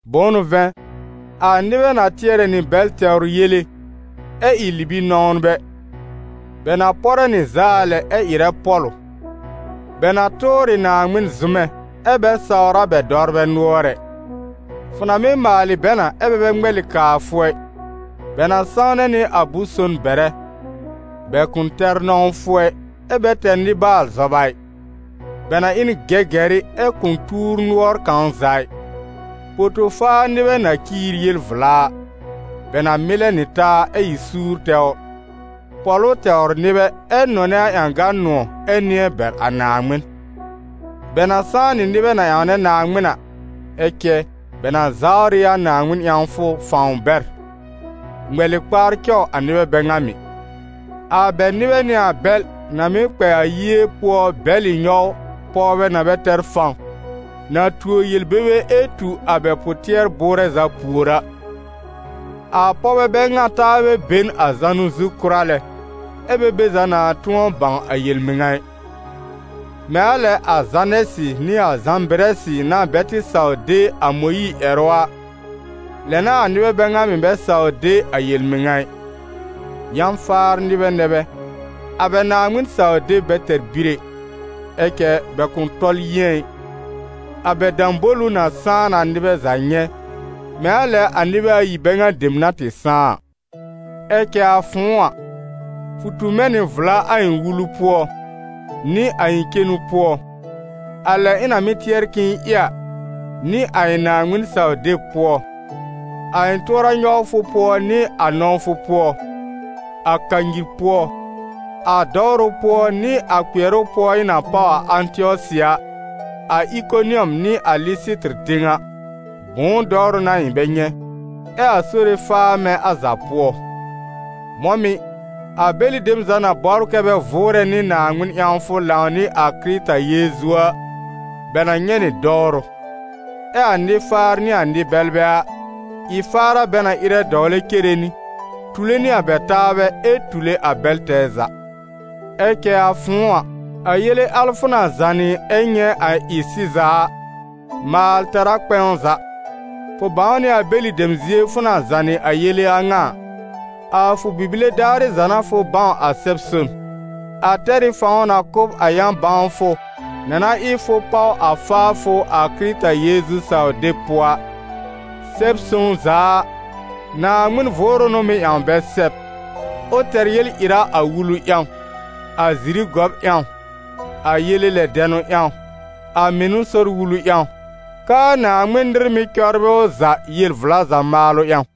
Bʋ̃ʋ n'ʋ vɛ̃, a nɩbɛ na tɩɛrɛ nɩ bɛl tɛwr yele, ɛ ɩ libi-nɔ̃wnbɛ; bɛ na pɔrɛ nɩ zaa lɛ ɛ ɩrɛ pɔ̀lʋ, bɛ na tʋʋr ɩ Naaŋmɩn zʋmɛ, ɛ bɛ sawr a bɛ dɔwrbɛ nʋɔr ɛ; fʋ na mɩ́ maalɩ bɛ na, ɛ́ bɛ bɛ ŋmɛlɩ kaa fʋ ɛ, bɛ na sãwnɛ nɩ a bʋ̃-son bɛrɛ. Bɛ kʋ̃ tɛr nɔ̃wfʋ ɛ, ɛ bɛ tɛr nɩ-baal-zɔba ɩ. Bɛ na ɩ n gɛgɛrɩ, ɛ kʋ̃ tuur nʋɔr kãw za ɩ, poto-faar nɩbɛ na ciir yel vla a. Bɛ na mɩlɛ nɩ taa, ɛ ɩ suur tɛwr, pɔ̀lʋ tɛwr nɩbɛ, ɛ́ nɔnɛ a ƴãgan nʋ̃ɔ̀ ɛ nɩ̃ɛ bɛr a Naaŋmɩn. Bɛ na sãá nɩ nɩbɛ na ƴãwnɛ Naaŋmɩn a, ɛ cɛ bɛ na zawr ɩ a Naaŋmɩn ƴãwfʋ fãw bɛr. Ŋmɛlɩ kpaar cɔw a nɩbɛ bɛ ŋa mɩ̀! A bɛ nɩbɛ n'ɩ a bɛl na mɩ́ kpɛ a yie pʋɔ bɛlɩ nyɔw pɔwbɛ na bɛ tɛr fãw, na tuo yel-bebe ɛ tu a bɛ pʋ-tɩɛr-bʋʋrɛ za pùor a; a pɔwbɛ bɛ ŋa taabɛ be n a zanʋ zu kʋra lɛ, ɛ bɛ be za na tʋ̃ɔ bãw a yel-mɩŋa ɩ. Mɛ̃ a lɛ a Zanɛsɩ nɩ a Zãbɩrɛsɩ na bɛ tɩ saw de a Mõyiir ƴɛrʋ a, lɛ n'a a nɩbɛ bɛ ŋa mɩ̀ bɛ saw de a yel-mɩŋa ɩ. Yã-faar nɩbɛ nɛ bɛ, a bɛ Naaŋmɩn-saw-deb bɛ tɛr bir ɛ. Ɛ cɛ bɛ kʋ̃ tɔl yɩ̃ɛ ɩ, a bɛ dãbolu na sãá na nɩbɛ za nyɛ̃, mɛ̃ a lɛ a nɩbɛ ayi bɛ ŋa dem na tɩ sãá a. Ɛ cɛ a fʋ̃ʋ a, fʋ tu mɛ̃ nɩ vla a ɩ̃ wulu pʋɔ, nɩ a ɩ̃ cenu pʋɔ, a lɛ ɩ̃ na mɩ́ tɩɛr k'ɩ̃ɩ ɩ a, nɩ a ɩ̃ Naaŋmɩn-saw-deb pʋɔ, a ɩ̃ tʋɔra-nyɔwfʋ pʋɔ nɩ a nɔ̃wfʋ pʋɔ, a kanyir pʋɔ, a dɔwrʋ pʋɔ nɩ a kpɩɛrʋ pʋɔ ɩ̃ na páw a Ãtɩɔsɩ a, a Ɩkonɩɔm nɩ a Lɩsɩtɩr tẽw a. Bʋ̃ʋ dɔwrʋ n'a ɩ̃ bɛ nyɛ̃! Ɛ a Sore faa mɛ̃ a za pʋɔ! Mɔ̃ mɩ̀, a bɛlɩ dem za na bɔbr kɛ́ bɛ vʋʋrɛ nɩ Naaŋmɩn ƴãwfʋ lãw nɩ a Kɩrɩta Yeezu a, bɛ na nyɛ̃ nɩ dɔwrʋ. Ɛ a nɩ-faar nɩ a nɩ-bɛlbɛ a, ɩ-faar a bɛ na ɩrɛ dɔwlɛ cere nɩ, tule nɩ a bɛ taabɛ ɛ tule a bɛl tɛɛ za. Ɛ cɛ a fʋ̃ʋ a, a yele al fʋ na zànɩ ɛ nyɛ̃ a ɩ sɩza a, maal tɛr a kpɛ̃w za. Fʋ bãw nɩ a bɛlɩ dem zie fʋ na zànɩ a yele a ŋa a. A fʋ bibile daarɩ za n'a fʋ bãw a Sɛb-son. A tɛr ɩ fãw na kʋ̀ b a yã-bãwfʋ na na ɩ fʋ páw a faafʋ a Kɩrɩta Yeezu saw-deb pʋɔ a. Sɛb-sõw za a, Naaŋmɩn Vʋʋrʋ n'ʋ mɩ́ ƴãw bɛ sɛb, ʋ tɛr yel-ɩra a wulu ƴãw, a ziri gɔb ƴãw, a yele lɛ dɛnʋ ƴãw, a mɩnʋ sɔr wulu ƴãw, k'aa Naaŋmɩn nɩr mɩ́ cɔbrɩ ʋ za yel-vla za maalʋ ƴãw.